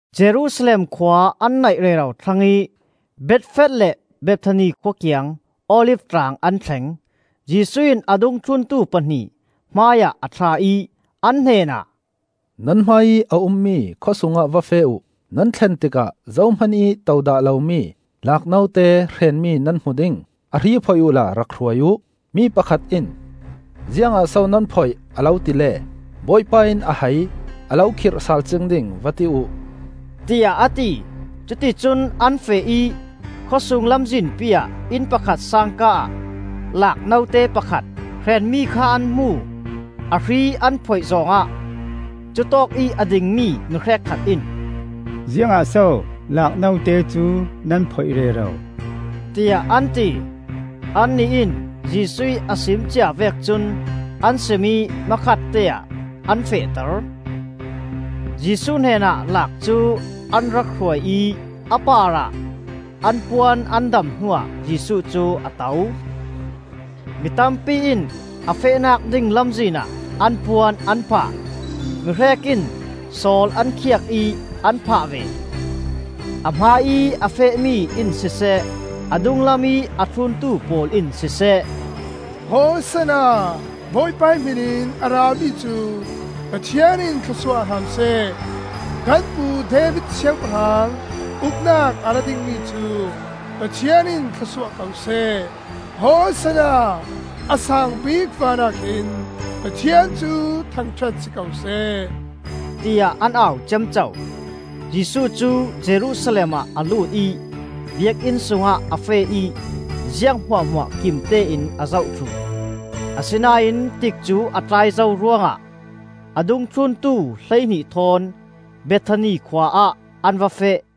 Jerusalem khua an naih rero thlang ih Bethfath le Bethani khua kiang Olif tlang an thleng. Jesuh in a dungthluntu pahnih hmaiah a thlah ih, an hnenah, “Nan hmaiih a ummi khawsungah va feh uh. Nan thlen tikah zohman ih to dah lomi laak note hreenmi nan hmu ding. A hri phoih uhla rak hruai uh. Mi pakhat in, ‘Ziangah so nan phoih?’ a lo ti le, ‘Bawipa in a hai, a lo khirh sal cing ding,’ va ti uh,” tiah a ti. Cuticun an feh ih khawsung lamzinpi ah, inn pakhat sangka ah laak note pakhat hreenmi kha an hmu. A hri an phoih zawng ah, cutawkih a dingmi mi hrekkhat in, “Ziangah so laak note cu nan phoih rero,” tiah an ti. Annih in Jesuh ih a sim cia vek cun an sim ih hmakhatte ah an fehter. Jesuh hnenah laak cu an rak hruai ih a parah an puan an dam hnuah Jesuh cu a to. Mi tampi in a fehnak ding lamzin ah an puan an phah; mi hrek in sawl an khiak ih an phah ve. A hmaiih a fehmi in siseh, dunglamih a thluntu pawl in siseh: “Hosanna! Bawipa hmin in a rami cu Pathian in thlawsuah hram seh! Kan pu David Siangpahrang uknak a ra dingmi cu Pathian in thlawsuah ko seh! Hosanna! A saangbik vanah khin Pathian cu thangṭhat si ko seh,” tiah an au ciamco. Jesuh cu Jerusalem ah a lut ih Biakinn sungah a feh ih ziang hmuahhmuah kimtein a zoh thluh. Asinain tikcu a tlai zo ruangah a dungthluntu hleihnih thawn Bethani khua ah an va feh.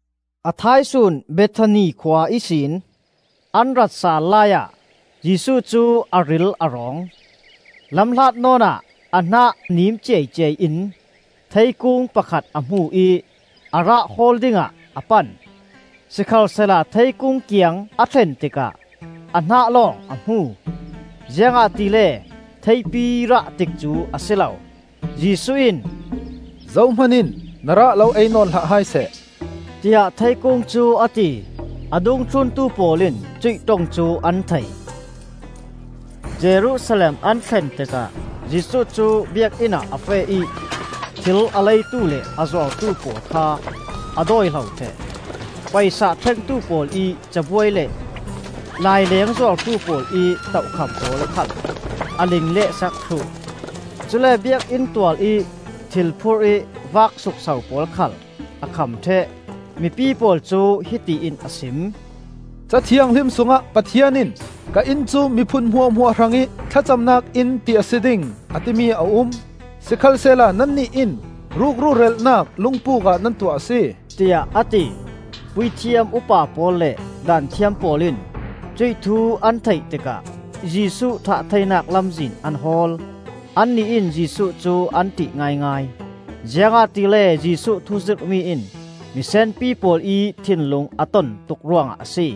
A thaisun Bethani khua ihsin an rat sal laiah Jesuh cu a ril a rawng. Lamhlat nawnah a hnah niim ciaiciai in theikung pakhat a hmu ih a rah hawl dingah a pan. Sikhalsehla theikung kiang a thlen tikah a hnah lawng a hmu; ziangahtile theipi rah tikcu a si lo. Jesuh in, “Zohman in na rah lo ei nawn hlah hai seh,” tiah theikung cu a ti. A dungthluntu pawl in cuih ṭong cu an thei. Jerusalem an thlen tikah Jesuh cu Biakinn ah a feh ih thil a leitu le a zuartu pawl kha a dawihlo ṭheh. Paisa thlengtu pawl ih cabuai le laileng zuartu pawl ih tohkham pawl khal a lingleh sak thluh. Cule Biakinn tualih thil phurih vak sukso pawl khal a kham ṭheh. Mipi pawl cu hiti in a sim: “Ca Thianghlim sungah Pathian in ‘Ka inn cu miphun hmuahhmuah hrangih thlacamnak inn ti a si ding,’ a timi a um. Sikhalsehla nannih in rukru relhnak lungpuk ah nan tuah a si,” tiah a ti. Puithiam upa pawl le Daanthiam pawl in cuih thu an theih tikah Jesuh thah theinak lamzin an hawl. Annih in Jesuh cu an ṭih ngaingai, ziangahtile Jesuh thuzirhmi in misenpi pawl ih thinlung a ton tuk ruangah a si.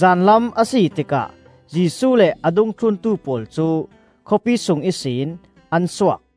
Zanlam a si tikah Jesuh le a dungthluntu pawl cu khawpi sung ihsin ah suak.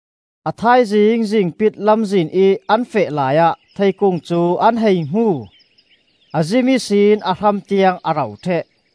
A thaizing zingpit lamzinih an feh laiah theikung cu an hei hmu. A zim ihsin a hram tiang a ro ṭheh.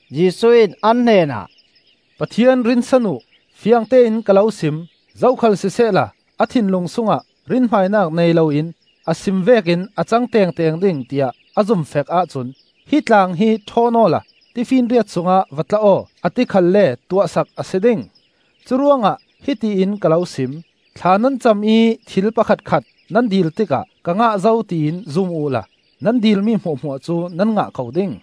Jesuh in an hnenah, “Pathian rinsan uh! Fiangtein ka lo sim: zokhal sisehla a thinlung sungah rinhmainak nei loin a sim vekin a cang tengteng ding tiah a zumfek ahcun, ‘Hi tlang hi thawn awla tifinriat sungah va tla aw,’ a ti khalle tuah sak a si ding. Curuangah hiti in ka lo sim: thla nan cam ih thil pakhatkhat nan dil tikah ka ngah zo tiin zum uhla nan dil mi hmuahhmuah cu nan ngah ko ding.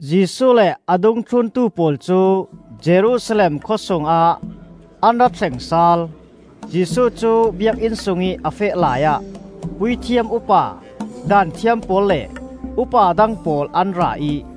Jesuh le a dungthluntu pawl cu Jerusalem khua sungah an ra thleng sal. Jesuh cu Biakinn sungih a feh laiah puithiam upa, Daanthiam pawl le upa dang pawl an ra ih,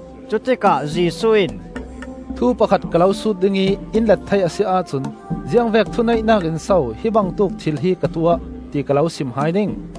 Cutikah Jesuh in, “Thu pakhat ka lo sut dingih in let thei a si ahcun ziangvek thuneihnak in so hi bangtuk thil hi ka tuah, ti ka lo sim hai ding.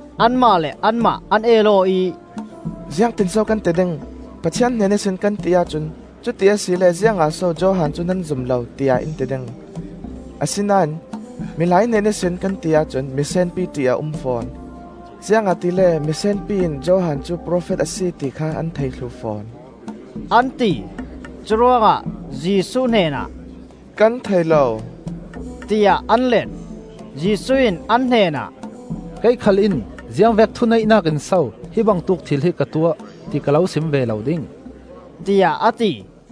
Anmah le anmah an el aw ih, “Ziangtin so kan ti ding? ‘Pathian hnen ihsin,’ kan ti ahcun ‘Cuti asile ziangah so Johan cu nan zum lo?’ tiah in ti ding. Asinain, ‘Milai hnen ihsin,’ kan ti ahcun misenpi ṭih a um fawn, ziangahtile misenpi in Johan cu profet a si ti kha an thei thluh fawn,” an ti. Curuangah Jesuh hnenah, “Kan thei lo,” tiah an let. Jesuh in an hnenah, “Kei khal in ziangvek thuneihnak in so hi bangtuk thil hi ka tuah, ti ka lo sim ve lo ding,” tiah a ti.